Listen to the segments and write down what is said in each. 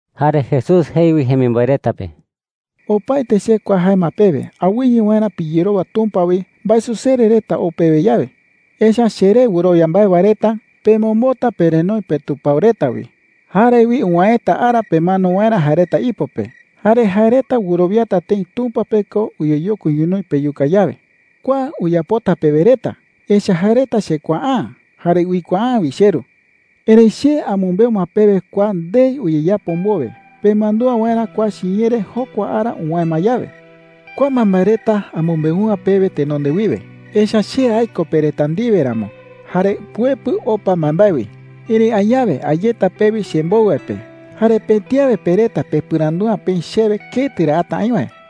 Jare Jesús jei wi jemimboe reta pe: “Opaete che kua jae ma pewe awɨye waerä piyerowa Tumpa wi mbaesusere reta ou pewe yawe. Echa’ä cheré wɨrowia mbae wae reta pemombota perenoi petupao reta wi. Jare wi uwäeta ara pemano waerä jae reta ipo pe. Jare jae reta wɨrowiata tëi Tumpa pe ko uyeyokui ñonoï peyuka yawe,” jei chupe reta. “Kua uyapota pewe reta, echa’ä jae reta chekuaa’ä jare uikuaa’ä wi cheRu. Erëi che amɨmbeu ma pewe kua ndei uyeyapo mbowe pemandúa waerä kua chiñee re jokua ara uwäe ma yawe,” jei chupe reta. Espíritu Santo mbarawɨkɨ uyapota wae “Kua mbaembae reta amɨmbeu’ä pewe tenonde wiwe, echa’ä che aiko pe reta ndiwe ramo jare puepɨ opa mbaembae wi. Erëi añawe a yeta pewi chembou wae pe, jare pëti awe pe reta pepɨrandu’ä peï chewe ketɨ ra ata aï wae.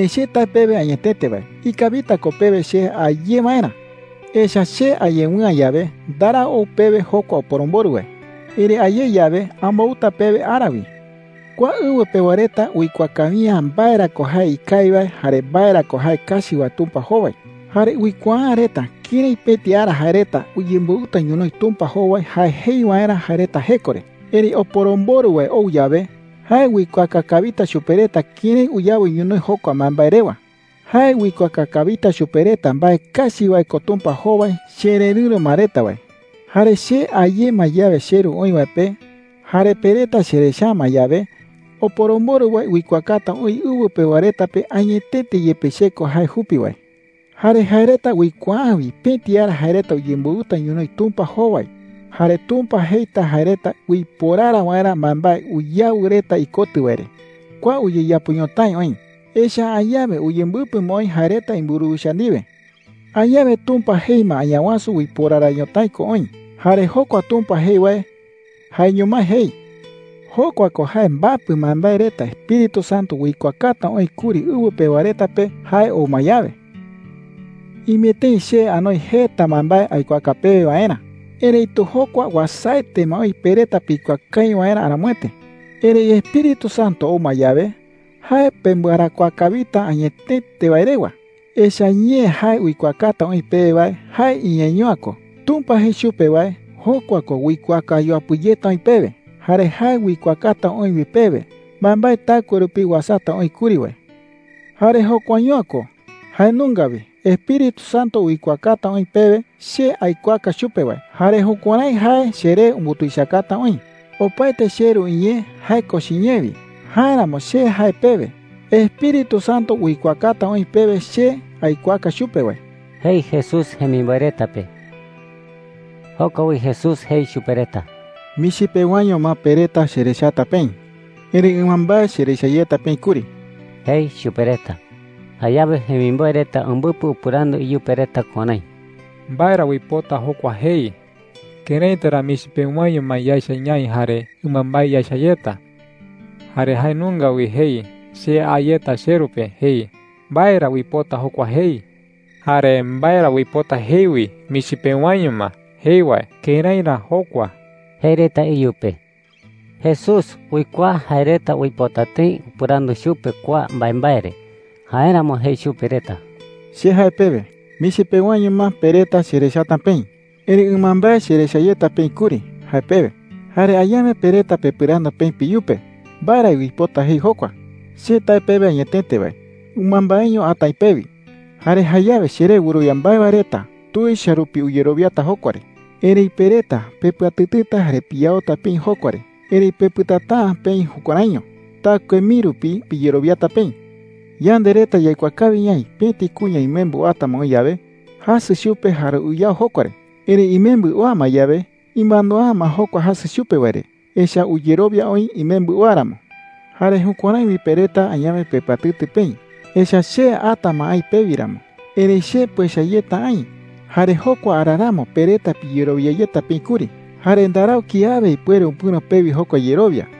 “Erëi che tae pewe añetete wae, ikawita ko pewe che a ye waerä. Echa’ä che a yewɨ'ä yawe, ndarau ou pewe jokua Oporomborɨ wae. Erëi a ye yawe, ambouta pewe ara wi,” jei chupe reta. “Kua ɨwɨ pewa reta uikuaa kawi’ä mbae ra ko jae ikawi wae jare mbae ra ko jae kachi wae Tumpa jowai. Jare uikuaa’ä reta kërái pëti ara jae reta uyemboɨta ñonoï Tumpa jowai jae jei waerä jae reta jeko re. Erëi Oporomborɨ wae ou yawe, jae uikuaaka kawita chupe reta kërái uyawɨ ñonoï jokua mbaembae rewa,” jei chupe reta. “Jae uikuaaka kawita chupe reta mbae kachi wae ko Tumpa jowai chererɨ̈ro ma reta wae. Jare che a ye ma yawe cheRu oï wae pe jare pe reta cherecha’ä ma yawe, Oporomborɨ wae uikuaakata oï ɨwɨ pewa reta pe añetete yepe che ko jae jupi wae,” jei. “Jare jae reta uikuaa’ä wi pëti ara jae reta uyemboɨta ñonoï Tumpa jowai, jare Tumpa jeita jae reta uiporara waerä mbaembae uyawɨ reta ikotɨ wae re. Kua uyeyapo ñotái oï, echa’ä añawe uyembɨpɨ ma oï jae reta imburuwicha ndiwe. Añawe Tumpa jei ma Añawasu uiporara ñotái ko oï, jare jokua Tumpa jei wae jaeño mái jei. Jokua ko jae mbapɨ mbaembae reta Espíritu Santo uikuaakata oï kuri ɨwɨ pewa reta pe jae ou ma yawe,” jei Jesús jemimboe reta pe. “Ime tëi che anoi jeta mbaembae aikuaaka pewe waerä. Erëitu jokua uasaete ma oï pe reta pikuaa kawi waerä aramoete,” jei chupe reta. “Erëi Espíritu Santo ou ma yawe, jae pembɨarakuaa kawita añetete wae rewa. Echa’ä ñee jae uikuaakata oï pewe wae jae iñeeño’ä ko. Tumpa jei chupe wae, jokua ko uikuaaka yuapɨ yeta oï pewe. Jare jae uikuaakata oï wi pewe mbaembae taɨkue rupi uasata oï kuri wae,” jei. “Jare jokuaño’ä ko. Jae nunga wi Espíritu Santo uikuaakata oï pewe che aikuaaka chupe wae, jare jukuärái jae cheree umbutuichakata oï,” jei chupe reta. “Opaete cheRu iñee, jae ko chiñee wi. Jáeramo, che jae pewe, Espíritu Santo uikuaakata oï pewe che aikuaaka chupe wae,” jei Jesús jemimboe reta pe. Joko wi Jesús jei chupe reta: “Michi pewaño ma pe reta cherechata peï. Erëi ɨmambae cherecha yeta peï kuri,” jei chupe reta. Jayawe jemimboe reta umbɨpɨ upɨrandu iyupe reta kuärái: “¿Mbae ra uipota jokua jei? ¿Këraita ra michi pewaño ma yaecha ñaï jare ɨmambae yaecha yeta? Jare jae nunga wi jei, ‘Che a yeta cheRu pe,’ jei. ¿Mbae ra uipota jokua jei? Jare ¿mbae ra uipota jei wi, ‘Michi pewaño ma,’ jei wae? ¿Kërái ra jokua?” jei reta iyupe. Jesús uikuaa jae reta uipota tëi upɨrandu chupe kua mbaembae re. Jáeramo jei chupe reta: “Che jae pewe, ‘Michi pewaño ma pe reta cherechata peï. Erëi ɨmambae cherecha yeta peï kuri,’ jae pewe. Jare añawe pe reta pepɨrandu peï peyupe mbae ra uipota jei jokua,” jei chupe reta. “Che tae pewe añetete wae, ɨmambaeño ata aï pewi. Jare jayawe cheré wɨrowia mbae wae reta tuicha rupi uyerowiata jokua re. Erëi pe reta pepɨatɨtɨta jare piyaota peï jokua re. Erëi pepɨtata’ä peï jukuäraiño. Taɨkue mii rupi piyerowiata peï,” jei chupe reta. “Yande reta yaikuaa kawi ñaï pëti kuña imembɨ oata ma oï yawe, jasɨ chupe jare uyao jokua re. Erëi imembɨ oa ma yawe, imandua’ä ma jokua jasɨ chupe wae re. Echa’ä uyerowia oï imembɨ oa ramo,” jei chupe reta. “Jare jukuärái wi pe reta añawe pepɨatɨtɨ peï, echa’ä che ata ma aï pewi ramo. Erëi che puecha yeta aï, jare jokua ara ramo pe reta piyerowia yeta peï kuri. Jare ndarau kiawe ipuere upɨ̈ro pewi jokua yerowia.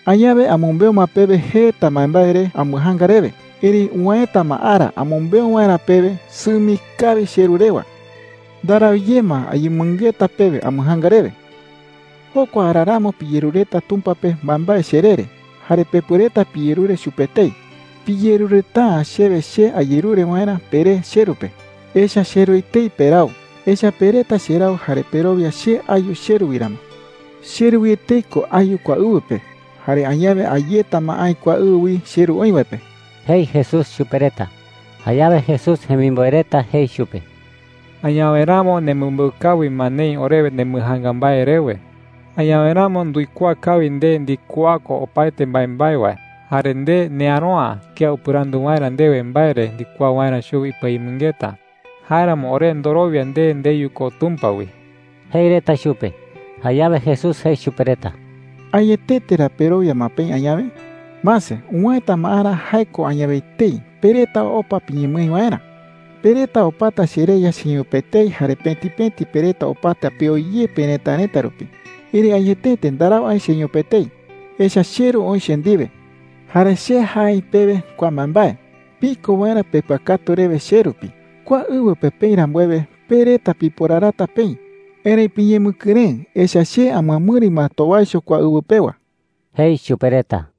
“Añawe amɨmbeu ma pewe jeta mbaembae re ambɨjaanga rewe. Erëi uwäeta ma ara amɨmbeu waerä pewe sɨmi kawi cheRu rewa. Ndarau ye ma ayemɨngeta pewe ambɨjaanga rewe,” jei chupe reta. “Jokua ara ramo piyerureta Tumpa pe mbaembae cheree re. Jare pepuereta piyerure chupe etei. Piyerureta’ä chewe che ayerure waerä peré cheRu pe. Echa’ä cheRu etei perau, echa’ä pe reta cherau jare perowia che ayu cheRu wi ramo,” jei chupe reta. “CheRu wi etei ko ayu kua ɨwɨ pe. Jare añawe a yeta ma aï kua ɨwɨ wi cheRu oï wae pe,” jei Jesús chupe reta. Jayawe Jesús jemimboe reta jei chupe: “Añawe ramo nemɨmbeu kawi ma neï orewe nembɨjaanga mbae rewe,” jei reta. “Añawe ramo nduikuaa kawi nde ndikuaa ko opaete mbaembae wae. Jare nde neäro’ä kía upɨrandu waerä ndewe mbae re ndikuaa waerä chuwi ipɨayemɨngeta. Jáeramo ore ndorowia nde ndeyu ko Tumpa wi,” jei reta chupe. Jayawe Jesús jei chupe reta: “¿Añetete ra perowia ma peï añawe? Mase, uwäeta ma ara – jae ko añawe etei – pe reta opa piñemɨái waerä. Pe reta opata chereya cheño pe etei jare pëti pëti pe reta opata peo ye perëtarëta rupi. Erëi añetete ndarau aï cheño pe etei, echa’ä cheRu oï che ndiwe,” jei chupe reta. “Jare che jae aï pewe kua mbaembae piko waerä pepɨakatu rewe che rupi. Kua ɨwɨ pe peï rambuewe, pe reta piporarata peï. Erëi piñemɨkɨrëɨ, echa’ä che amɨamɨri ma towaicho kua ɨwɨ pewa,” jei chupe reta.